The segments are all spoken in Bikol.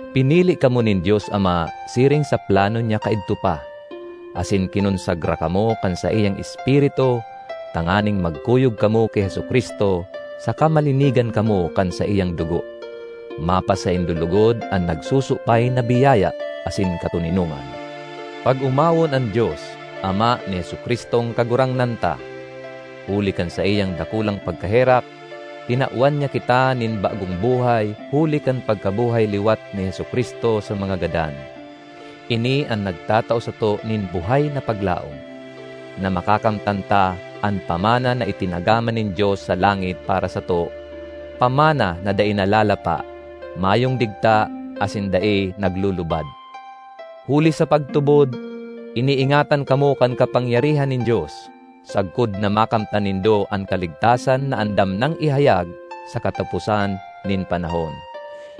Pinili kamo nin Dios Ama siring sa plano niya kaidto pa, asin kinonsagra kamo kan saiyang Espiritu tanganing magkuyog kamo ki Jesu-Cristo saka malinigan kamo kan saiyang dugo. Mapasaindo logod an nagsusupay na biyaya asin katoninongan. Pag-omawon an Dios, Ama ni Jesu-Cristong Kagurangnan ta! Huli kan saiyang dakulang pagkaherak, tinawan niya kita nin bagong buhay huli kan pagkabuhay liwat ni Jesu-Cristo sa mga gadan. Ini an nagtatao sato nin buhay na paglaom, na makakamtan ta an pamana na itinagama nin Dios sa langit para sato, pamana na dai nalalapa, mayong digta asin dai naglulubad. Huli sa pagtubod, iniingatan kamo kan kapangyarihan nin Dios, sagkod na makamtan nindo an kaligtasan na andam nang ihayag sa kataposan nin panahon.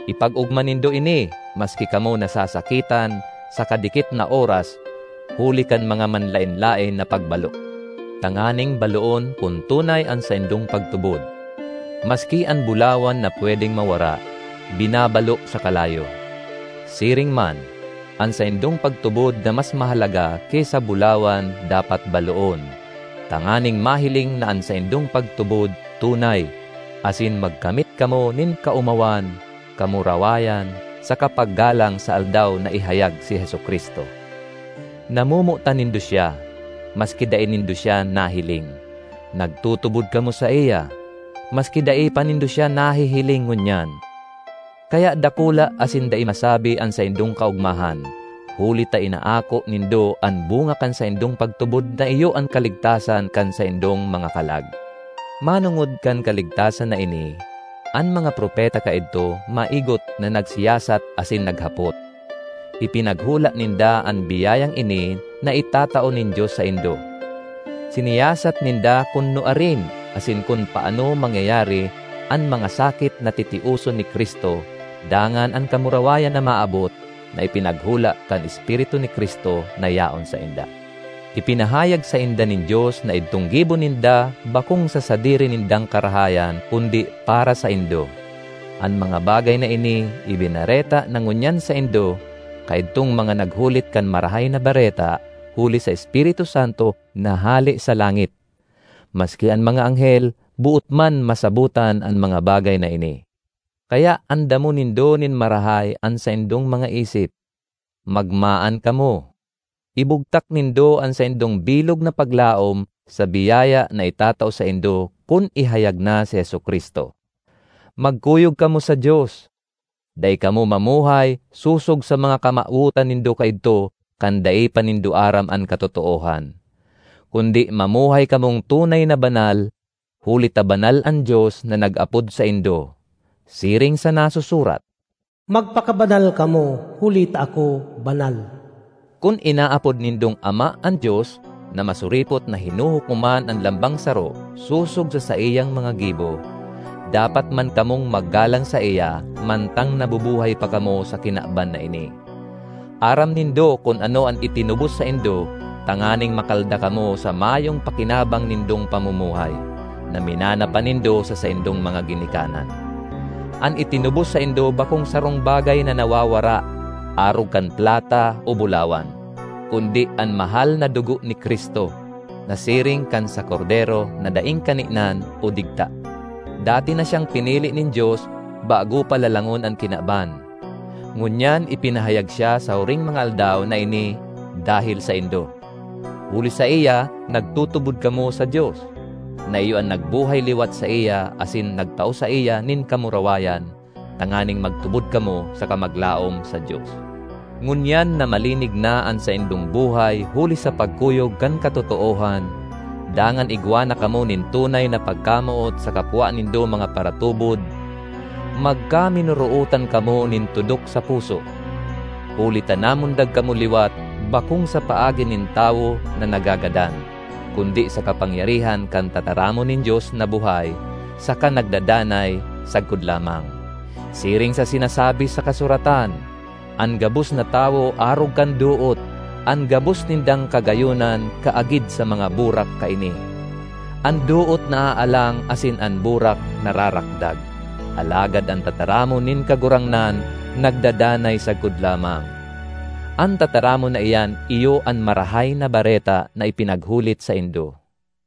Ipag-ogma nindo ini maski kamo nasasakitan sa kadikit na oras huli kan mga manlaen-laen na pagbalo, tanganing baloon kun tunay an saindong pagtubod. Maski an bulawan na pwedeng mawara, binabalo sa kalayo; siring man, an saindong pagtubod na mas mahalaga ki sa bulawan dapat baloon, tanganing mahiling na an saindong pagtubod tunay, asin magkamit kamo nin kaomawan, kamurawayan saka paggalang sa Aldaw na ihayag si Jesu-Cristo. Namomotan nindo siya, maski dai nindo siya nahiling; nagtutubod kamo saiya, maski dai pa nindo siya nahihiling ngunyan; kaya dakula asin dai masabi an saindong kaogmahan, huli ta inaako nindo an bunga kan saindong pagtubod na iyo an kaligtasan kan saindong mga kalag. Manongod kan kaligtasan na ini, an mga propeta kaidto maigot na nagsiyasat asin naghapot; ipinaghula ninda an biyayang ini na itatao nin Dios saindo. Siniyasat ninda kun nuarin asin kun paano mangyayari an mga sakit na titioson ni Cristo dangan an kamurawayan na maabot na ipinaghula kan Espiritu ni Cristo na yaon sainda. Ipinahayag sainda nin Dios na idtong gibo ninda bakong sa sadiri nindang karahayan kundi para saindo. An mga bagay na ini ibinareta na ngunyan saindo kaidtong mga naghulit kan Marahay na Bareta huli sa Espiritu Santo na hale sa langit. Maski an mga anghel boot man masabotan an mga bagay na ini. Kaya andamon nindo nin marahay an saindong mga isip; magmaan kamo; ibugtak nindo an saindong bilog na paglaom sa biyaya na itatao saindo kun ihayag na si Jesu-Cristo. Magkuyog kamo sa Dios; dai kamo mamuhay sosog sa mga kamawotan nindo kaidto kan dai pa nindo aram an katotoohan. Kundi mamuhay kamong tunay na banal, huli ta banal an Dios na nag-apod saindo. Siring sa nasusurat, “Magpakabanal kamo huli ta ako banal.” Kun inaapod nindong Ama an Dios na masuripot na hinuhukoman an lambang saro sosog sa saiyang mga gibo, dapat man kamong maggalang saiya mantang nabubuhay pa kamo sa kinaban na ini. Aram nindo kun ano an itinubos saindo tanganing makalda kamo sa mayong pakinabang nindong pamumuhay, na minana pa nindo sa saindong mga ginikanan. An itinubos saindo bakong sarong bagay na nawawara, arog kan plata o bulawan, kundi an mahal na dugo ni Cristo, na siring kan sa kordero na daing kaninan o digta. Dati na siyang pinili nin Dios bago pa lalangon an kinaban; ngunyan ipinahayag siya sa huring mga aldaw na ini dahel saindo. Huli saiya nagtutubod kamo sa Dios, na iyo an nagbuhay liwat saiya asin nagtao saiya nin kamurawayan, tanganing magtubod kamo saka maglaom sa Dios. Ngunyan na malinig na an saindong buhay huli sa pagkuyog kan katotoohan, dangan igwa na kamo nin tunay na pagkamoot sa kapwa nindo mga paratubod, magkaminorootan kamo nin tudok sa puso. Huli ta namundag kamo liwat bakong sa paagi nin tawo na nagagadan, kundi sa kapangyarihan kan tataramon nin Dios na buhay saka nagdadanay sagkod lamang. Siring sa sinasabi sa kasuratan, “An gabos na tawo arog kan doot; An gabos nindang kagayonan kaagid sa mga burak kaini. An doot naaalang asin an burak nararakdag, alagad an tataramon nin Kagurangnan nagdadanay sagkod lamang.” An tataramon na iyan iyo an Marahay na Bareta na ipinaghulit saindo.